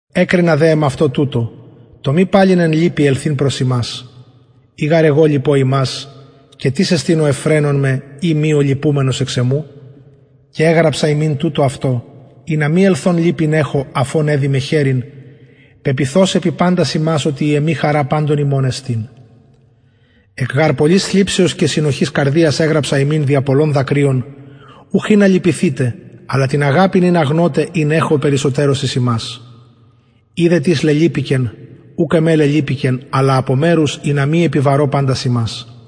εκρινα δε εμαυτω τουτο το μη παλιν εν λυπη προς υμας ελθειν ει γαρ εγω λυπω υμας και τις εστιν ο ευφραινων με ει μη ο λυπουμενος εξ εμου και εγραψα υμιν τουτο αυτο ινα μη ελθων λυπην εχω αφ ων εδει με χαιρειν πεποιθως επι παντας υμας οτι η εμη χαρα παντων υμων εστιν εκ γαρ πολλης θλιψεως και συνοχης καρδιας εγραψα υμιν δια πολλων δακρυων ουχ ινα λυπηθητε αλλα την αγαπην ινα γνωτε ην εχω περισσοτερως εις υμας ει δε τις λελυπηκεν ουκ εμε λελυπηκεν αλλα απο μερους ινα μη επιβαρω παντας υμας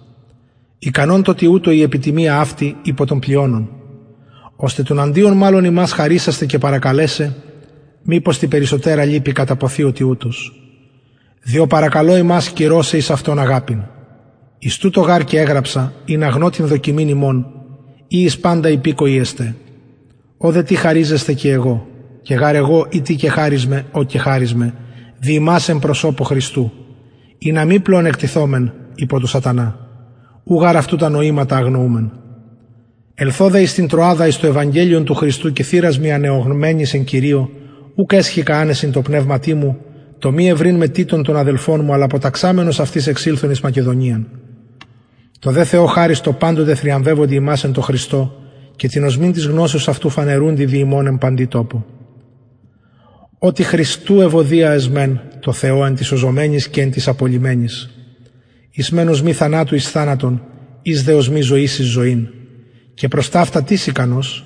ικανον τω τοιουτω η επιτιμια αυτη η υπο των πλειονων ωστε τουναντιον μαλλον υμας χαρισασθαι και παρακαλεσαι μηπως τη περισσοτερα λυπη καταποθη ο τοιουτος διο παρακαλω υμας κυρωσαι εις αυτον αγαπην εις τουτο γαρ και εγραψα ινα γνω την δοκιμην υμων ει εις παντα υπηκοοι εστε ω δε τι χαριζεσθε και εγω και γαρ εγω ει τι κεχαρισμαι ω κεχαρισμαι δι υμας εν προσωπω χριστου ινα μη πλεονεκτηθωμεν υπο του σατανα ου γαρ αυτου τα νοηματα αγνοουμεν ελθων δε εις την τρωαδα εις το ευαγγελιον του χριστου και θυρας μοι ανεωγμενης εν κυριω ουκ εσχηκα ανεσιν τω πνευματι μου τω μη ευρειν με τιτον τον αδελφον μου αλλα αποταξαμενος αυτοις εξηλθον εις μακεδονιαν τω δε θεω χαρις τω παντοτε θριαμβευοντι ημας εν τω χριστω και την οσμην της γνωσεως αυτου φανερουντι δι ημων εν παντι τοπω οτι χριστου ευωδια εσμεν τω θεω εν τοις σωζομενοις και εν τοις απολλυμενοις οις μεν οσμη θανατου εις θανατον οις δε οσμη ζωης εις ζωην και προς ταυτα τις ικανος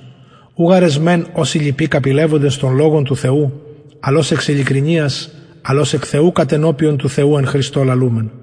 ου γαρ εσμεν ως οι λοιποι καπηλευοντες τον λογον του θεου αλλ ως εξ ειλικρινειας αλλ ως εκ θεου κατενωπιον του θεου εν χριστω λαλουμεν